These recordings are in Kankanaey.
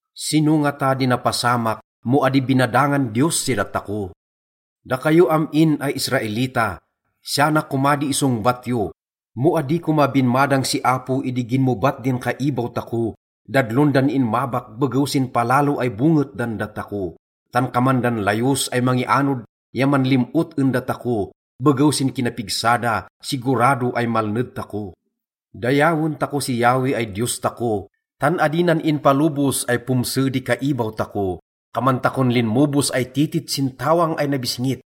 Sino ngata di napasamak mo adi binadangan Diyos si datako? Dakayo am-in ay Israelita, siya na koma di isongbat yo: Mo adi koma binmadang si Apo idi ginmobat din kaibaw tako, dadlon dan inmabak begew sin palalo ay bonget dan datako. Tan kaman dan layos ay mangianod ya manlim-ot en datako, begew sin kinapigsa da, sigurado ay malned tako. Dayawen tako si Yahweh ay Diyos tako, tan adi nan inpalobos ay pomse di kaibaw tako. Kaman takon linmobos ay titit sin tawang ay nabisngit.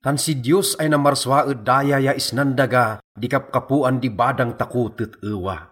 Tan si Diyos ay namarsua ed daya ya isnan daga di kapkapoan di badang tako tet-ewa.